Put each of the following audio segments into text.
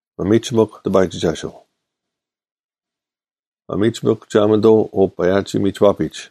ᒪᒥᒋᒥᐧᒄ ᑎᐸᔨᒋᒐᓱᐤ! ᒪᒥᒋᒥᐧᒄ ᒋᓴᒪᓂᑐᐤ ᐅᐸᔭᒋ-ᒥᒋᐛᐱᒡ: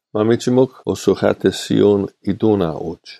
ᒪᒥᒋᒥᐧᒄ ᐅᓱᐧᑲᑎᓯᐅ-ᐃᑐᐅᓇ ᐅᒡ: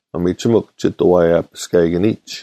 ᒪᒥᒋᒥᐧᒄ ᒋᑐ ᐛᔭᐱᔅᑲᐃᑭᓂᒡ: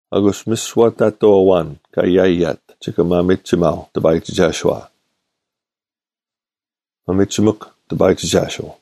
ᐊᑯᔅ ᒥᓯᐛ ᑕᑐᐤ ᐊᐛᓐ ᑲ ᔭᔭᑦ ᒋᑭ ᒪᒥᒋᒪᐤ ᑎᐸᔨᒋᒐᓱᐛ᙮ ᒪᒥᒋᒥᐧᒄ ᑎᐸᔨᒋᒐᓱᐤ!